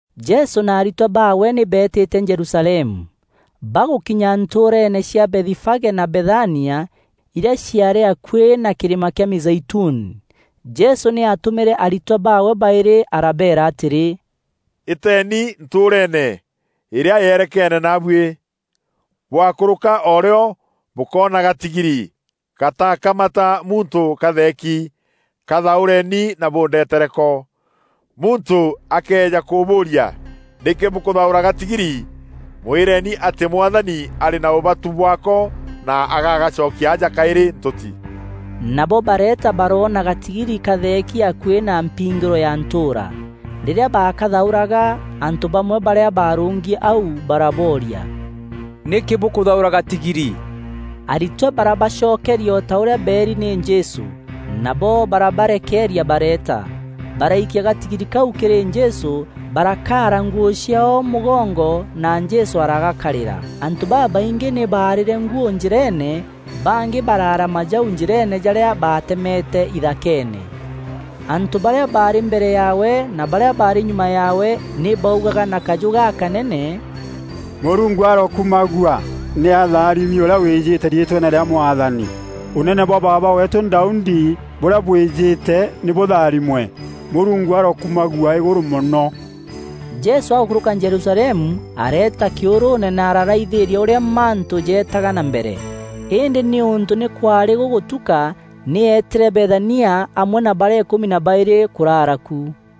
Jesû na aritwa baawe nî beetîte Jerusalemu. Bagûkinya ntûûreeene cia Bethifage na Bethania, irîa ciaarî akuî na kîrîma kîa Mîzeituni, Jesû nî aatûmîre aritwa baawe baîrî arabeera atîrî, “Îteeni ntûûreene îrîa yerekeene naabuî. Bwakûrûka o rîo, bûkoona gatigiri gatakamata muntû katheeki. Kathaûreni na bûndetere ko. Muntû akëeja kûbûûria, ‘Nîkî bûkûthaûra gatigiri, mwîreeni atî Mwathani arî na ûbatu bwaako na agagacokia aja kaîrî ntûti.’” Nabo bareeta baroona gatigiri katheeki akuî na mpingîro ya ntûûra. Rîrîa baakathaûraga, antû bamwe barîa barûngi au barabooria, “Nîkî bûkûthaûra gatigiri?” Aritwa barabacokeria o ta ûrîa beeri nî Jesû; nabo barabarekeeria bareeta. Baraikia gatigiri kau kîrî Jesû, barakaara nguû ciaao mûgongo na Jesû aragakarîra. Antû babaingî nî baarîre nguû njîreene bangî baraara majau njîreene jarîa baatemete ithakeene. Antû barîa baarî mbere yaawe na barîa baarî nyuma yaawe, nî baaugaga na kajû gakanene, “Mûrungu arokumagua! Nî atharimi ûrîa wîjîte riîtweene rîa Mwathani! Ûnene bwa baaba weetû Daudi, ûrîa wîjîte, nî bûtharimwe! Mûrungu arokumagua îgûrû mono.” Jesû agûkûrûka Jerusalemu areeta kîûrûûne na araraithîîria ûrîa mantû jeetaga na mbere. Îndî nîûntû nî kwaarî gûgûtuka, nî eetîre Bethania amwe na barîa îkûmi na baîrî kûrara ku.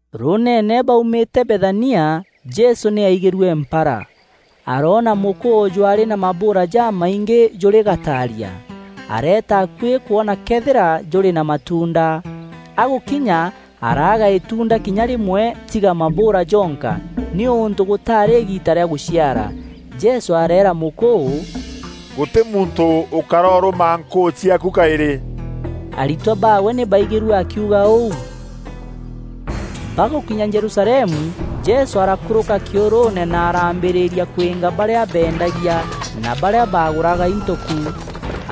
Rûûneene, baumîte Bethania, Jesû nî aigîrue mpara. Aroona mûkûû jwaarî na mabûûra jamaingî jûrî gataaria. Areeta akuî kwona këethîra jûrî na matuunda. Agûkinya araaga îtunda kinya rîmwe tiga mabûûra jonka, nîûntû gûtaarî îgiita rîa gûciara. Jesû areera mûkûû, “Gûtî muntû ûkaroorûma nkûû ciaaku kaîrî.” Aritwa baawe nî baigîrue akiuga ûu. Bagûkinya Jerusalemu, Jesû arakûrûka kîûrûûne na araambîrîria kwînga barîa beendagia na barîa bagûraga into ku.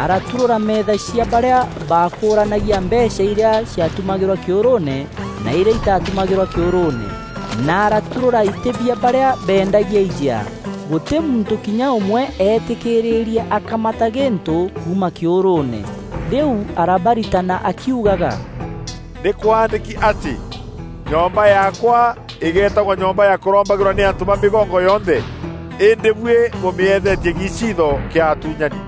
Araturûra meetha cia barîa baakûranagia mbeecha irîa ciatumagîrwa kîûrûûne na irîa itatumagîrwa kîûrûûne, na araturûra itî bia barîa beendagia ijea. Gûtî muntû kinya ûmwe eetîkîîrîrie akamata gîntû kuuma kîûrûûne. Rîu arabaritana akiugaga, “Nîkwaandîki atî, ‘Nyomba yaakwa îgeetagwa nyomba ya kûrombagîrwa nî antû ba mîgongo yonthe!’ Îndî buî bûmîethetie giiciitho kîa atûnyani!”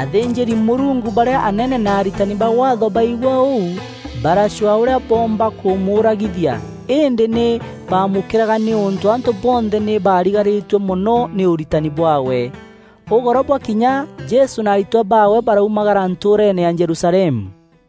Athînjîri-Mûrungu barîa anene na aritani ba Waatho baigua ûu, baracwaa ûrîa boomba kûmûûragithia îndî nî bamûkîraga nîûntû antû bonthe nî baarigarîtue mono nî ûritani bwaawe. Ûgoro bwakinya, Jesû na aritwa baawe baraumagara ntûûreene ya Jerusalemu.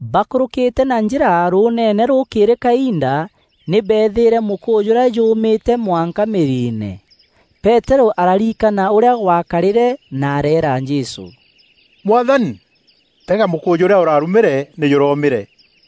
Bakûrûkîte na njîra rûûneene rûkîîrî kainda, nî beethîîre mûkûû jûrîa jûûmîte mwanka mîriine. Peterû ararikana ûrîa gwakarîre na areera Jesû, “Mwathani, tega mûkûû jûrîa ûrarumîre nî jûromîre.”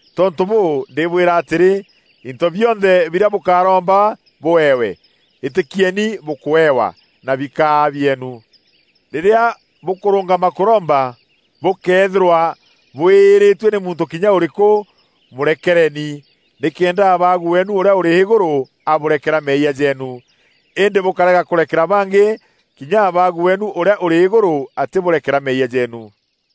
Tontû bûû, ndîbwîra atîrî, into bionthe birîa bûkaromba bûewe, îtîkieni bûkûewa, na bikaa bieenu. Rîrîa bûkûrûngama kûromba, bûkëethîrwa bwîîrîtue nî muntû kinya ûrîkû, mûrekereeni, nîkenda Abaagu weenu ûrîa ûrî Îgûrû abûrekera meeyia jeenu. Îndî bûkarega kûrekera bangî, kinya Abaagu weenu ûrîa ûrî Îgûrû atîbûrekera meeyia jeenu.”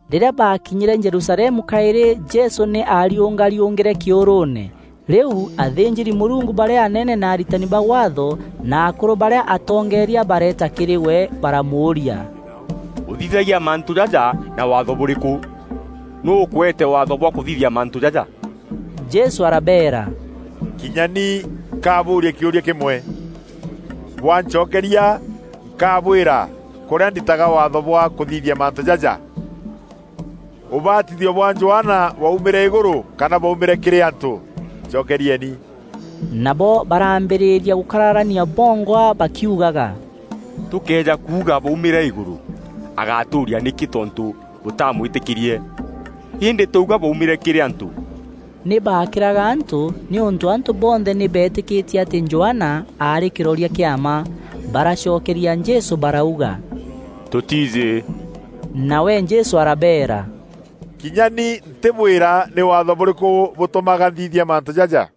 Rîrîa baakinyîîre Jerusalemu kaîrî Jesû nî aariûngariûngîre kîûrûûne. Rîu athînjîri-Mûrungu barîa anene na aritani ba Waatho na akûrû barîa atongeeria bareeta kîrî we, baramûûria, “Ûthithagia mantû jaja na Waatho bûrîkû? Nûû ûkweete waatho bwa kûthithia mantû jaja?” Jesû arabeera, “Kinya ni nkabûûria kîûria kîmwe. Bwancokeria, nkabwîra kûrîa nditaga waatho bwa kûthithia mantû jaja. Ûbatithio bwa Johana bwaumîre îgûrû kana bwaumîre kîrî antû? Ncokerieni!” Nabo baraambîrîria gûkararania bongwa bakiugaga, “Tûkëeja kuuga, ‘Bwaumîre îgûrû,’ agatûûria, ‘Nîkî tontû bûtamwîtîkîrie?’ Îndî twauga, ‘bwaumîre kîrî antû!’” (Nî baakîraga antû, nîûntû antû bonthe nî beetîkîtie atî Johana aarî kîroria kîa mma.) Baracokeria Jesû barauga, “Tûtiijî.” Nawe Jesû arabeera, “Kinya ni ntîbwîra nî Waatho bûrîkû bûtûmaga nthithia mantû jaja.”